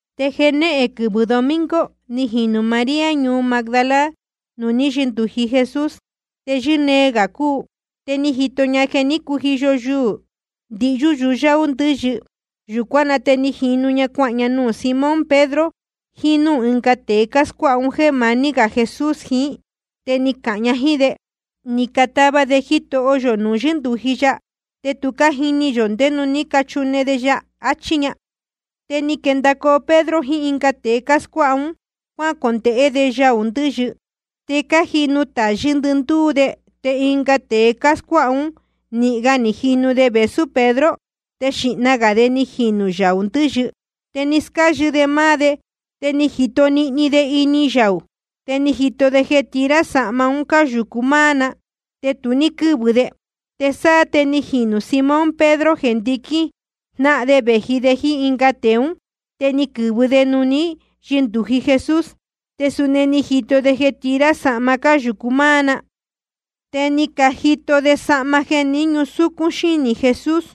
Te jenéhen quɨvɨ̄ domingo ni jinū María ñuu Magdala nuū ní yɨndūji Jesús, te yɨ́nee gā cúu. Te ni jito ña jeē ní cujiyo yuū ndihyú yuyáú ndɨ̄yɨ. Yūcuán na te jínu ña cuahān ña nuū Simón Pedro jiín núū ɨnga tēe scuáha ún jeē maní gā Jesús jiín. Te ni cahān ña jíín de: Ni catava de Jitoho yō nuū ní yɨndūji ya, te tu cájini yō ndé nuū ní cachune de ya, achí ña. Te ni quendacoo Pedro jiín ɨnga tēe scuáha ún, cuácondēhé de yaū ndɨ̄yɨ. Te cájinu tayɨ́ ndɨndúú de. Te ɨnga tēe scuáha ún, nīhin ga ni jinu de vēsú Pedro. Te xīhna gā de ni jinū yaū ndɨ̄yɨ. Te ni scáyɨ de máá de, te ni jito nihni de ini yaū. Te ni jito de jeē tira sahma un cáyūcu máá na. Te tu ní quɨ́vɨ de. Te sáá te ni jinū Simón Pedro jeē ndiquín jnáhan de vēji de jíín ɨnga tēe ún. Te ni quɨ̄vɨ de nuū ní yɨndūji Jesús. Te suni ni jito de jeē tira sahma cáyūcu máá na. Te ni jito de sahma jeē ni ñúsúcún xínī Jesús,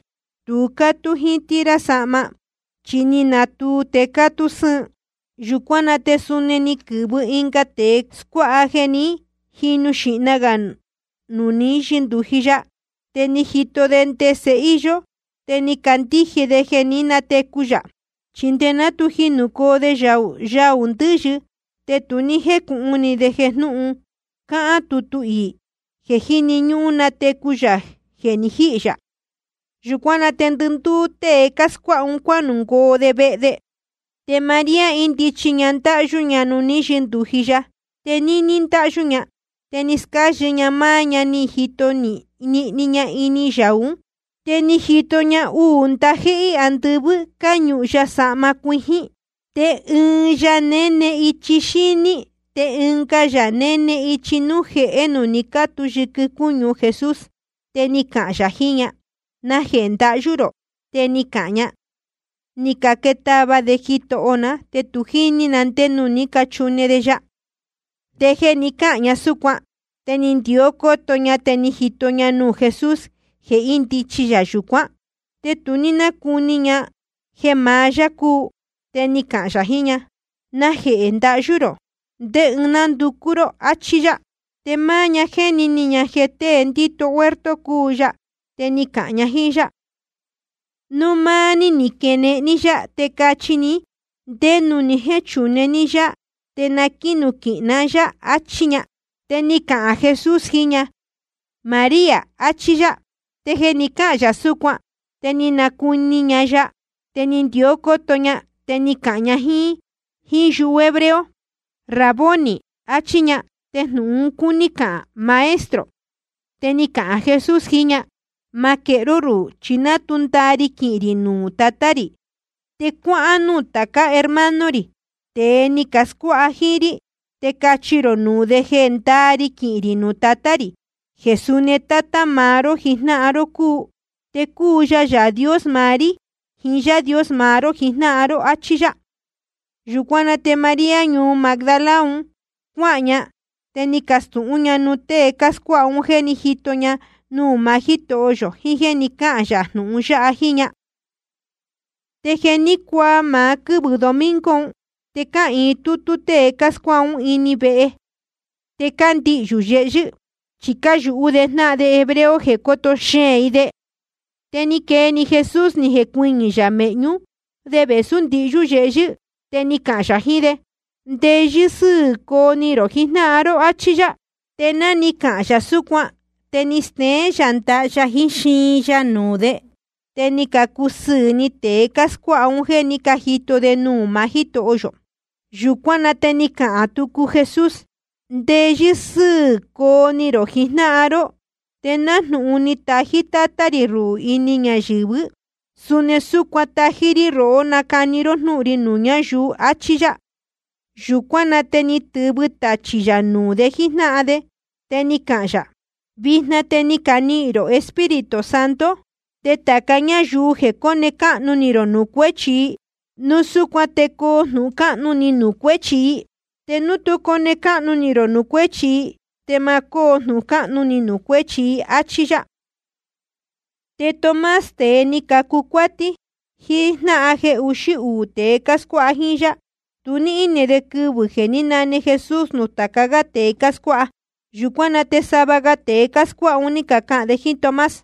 tu cátú jíín tira sahma, chi ni natuu te cátú sɨ́ɨn. Yūcuán na te suni ni quɨ̄vɨ ɨnga tēe scuáha jeē ni jínū xīhna gā nuū ní yɨndūji ya. Te ni jito de ndese íyó, te ni candíje de jeē ní natecu yā. Chi nde ná tu jinūcoo de yaū ndɨ̄yɨ, te tu ní jécūhun ni de jnūhun cáhán tutu iī, jeē jíni ñúhún natecu yā núu je ni jihī yā. Yūcuán na te ndɨndúú tée cáscuáha ún cuanungoo de vehe de. Te María índichi ña ndáhyú ña nuū ní yɨndūji ya. Te níní ndáhyú ña, te ni scáyɨ ña máá ña, ni jito nihni ña ini yaū ún. Te ni jito ña uū ndajéhé andɨvɨ́, cáñuhun ya sahma cuijín. Te ɨɨn ya néne ichi xíní, te ɨnga ya néne ichi núū jehé nuū ni cátu yɨquɨ cúñu Jesús. Te ni cacahān yā jiín ña: ¿Najehē ndahyú rō? Te ni cahān ña: Ni catava de Jitoho ná, te tu jíní na ndé nuū ní cachune de ya. Te jeē ni cáhān ña súcuan, te ni ndió cóto ña, te ni jito ña nuū Jesús jeē índichi yā yūcuán. Te tu ní nácuni ña jeē maá yá cúu. Te ni cahān yā jiín ña: ¿Najehē ndahyú rō? ¿Ndé ɨɨn nánducú ró? achí yá. Te máá ña jéni ni ña jeē tée ndíto huerto cúu ya. Te ni cahān ña jíín yá: Núu máá ní ni quenehen ní yá, te cachi ní ndé nuū ni jéchune ní yá, te na quínuquihin ná yá, achí ña. Te ni cahān Jesús jiín ña: María, achí yá. Te jeē ni cáhān yā súcuan, te ni nacuni ña ya, te ni ndió cóto ña, te ni cahān ña jíín yuhu hebreo: Raboni, achí ña. Te jnūhun un cúní cahān, Maestro. Te ni cahān Jesús jiín ña: Ma quehé ró rúhū, chi ná tu ndaa ri quinuhun rī nuū Tatá rī. Te cuáhán núū tācá hermano rī, tēe ni cascuáha jíín rí, te cachi rō nuū de jeē ndaa ri quinuhun rī nuū Tatá rī, jeē suni Tátá maá ró jijnáhan ró cúu. Te cúu ya Yaā Dios maá rí jiín Yaā Dios maá ró jijnáhan ró. Achí yá. Yūcuán na te María ñuu Magdala un, cuáhān ña, te ni castūhún ña nuū tée cáscuáha un jéē ní jito ña nuū maá Jítoho yō jiín jéē ni cáhān yā jnūhun yáha jíín ña. Te jeē ní cuaa máá quɨ́vɨ̄ domingo un, te cáhīin tútú tée cáscuáha ún ini ɨɨn vehe. Te cándihyū yehyɨ́, chi cáyūhú de jnáhan de hebreo jeē coto xeēn i de. Te ni quee‑ni Jesús, ni jecuɨñɨ̄ yā mēhñú de vēsú ndihyú yehyɨ́, te ni cahān yā jiín de: Ndeyɨ́ sɨ́ɨ̄ coo ni rō jijnáhan ró, áchí yá. Te ná ni cahān yā súcuan, te ni steén yā ndaha ya jiín xiin ya nuū de. Te ni cacusɨɨ̄ ni tēe cáscuáha un jéē ní cajito de nuū maá Jítoho yō. Yūcuán na te ni cahān tucu Jesús: Ndeyɨ́ sɨ́ɨ̄ coo ni rō jijnáhan ró. Te nájnūhun ni tají Tátá rī ruhū ini ñayɨ̄vɨ́, suni súcuan tájí rí rohó nacani ró jnúhun ri nuū ñáyuu. Achí yá. Yūcuán na te ni tɨ̄vɨ tachī yā nuū de jíjnáhan de. Te ni cahān yā: Vijna te ni canihīn rō Espíritu Santo. Te tāca ñáyuu jeē cone cáhnu ni rō nuū cuéchi i, núu súcuan te coo jnūhun cáhnu ni nuū cuéchi i. Te núu tú cone cáhnu ni rō nuū cuéchi i, te ma cóo jnūhun cáhnu ni nuū cuéchi i. Achí yá. Te Tomás, tēe ni cacu cuátí, ɨɨn jnáhan jeē uxí uū tēe cáscuáha jíín yá, tu ní íne de quɨvɨ̄ jeē ní nane Jesús nuū tāca gá tēe cáscuáha. Yūcuán na te sava ga tēe cáscuáha un, ní cacahān de jíín Tomás: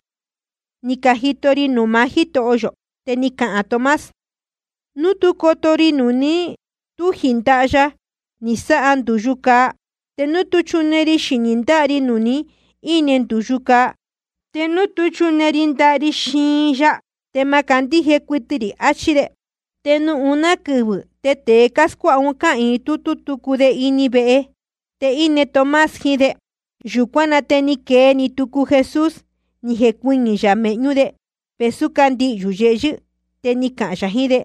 Ni cajito ri nuū maá Jítoho yō. Te ni cahān Tomás: Núu tú coto ri nuū ni túji ndaha ya ni sáha ndūyu cāa, te núu tú chune ri xinī ndáha ri nuū ni íne ndūyu cāa, te núu tú chune ri ndaha ri xiin ya, te ma candíje cuɨtɨ rī, achí de. Te nuū uná quɨvɨ̄, te tēe cáscuáha un cáhīin tútú tucu de ini ɨɨn vehe. Te íne Tomás jiín de. Yūcuán na te ni quee‑ni tucu Jesús, ni jecuɨñɨ̄ yā mēhñú de, vēsú cándihyū yehyɨ́. Te ni cahān yā jiín de: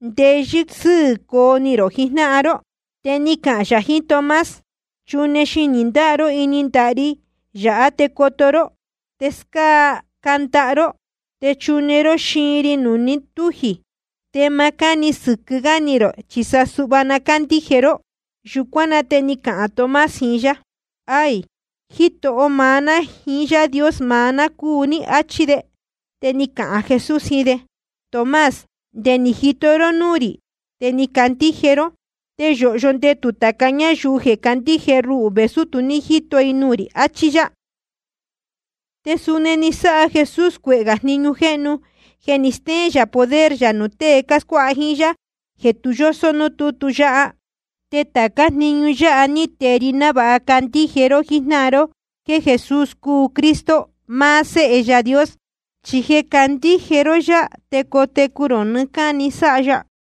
Ndeyɨ́ sɨ́ɨ̄ coo ni rō jijnáhan ró. Te ni cahān‑ni ya jiín Tomás: Chune xinī ndáha ró ini ndaha ri yāhá te coto ró. Te scáá ndaha ró, te chune ró xiin ri nuū ni tújī. Te ma cáni sɨquɨ́ gá ni rō, chi sa suhva na cándíje ró. Yūcuán na te ni cahān Tomás jiín yá: Aī, Jitoho maá ná jiín Yaā Dios maá ná cúu ní, áchí de. Te ni cahān Jesús jiín de: Tomás, nde ni jito ró núū rī, te ni candíje ró. Te yōhyo ndetū tāca ñáyuu jeē candíje ruhū vēsú tu ní jíto i nuū rī, achí yá. Te suni ni sáha Jesús cuehē gā jniñu jéhnu jeē ni stéén yā poder yā nuū tée cáscuáha jíín yá, jeē tu yósó núū tútu yáha. Te tācá jniñu yáha ní tee ri návāha candíje ró jijnáhan ró jéē Jesús cúu Cristo, maá Séhe Yaā Dios. Chi jeē candíje ró yá, te cotecu rō nɨɨ́ cáni sáha ya.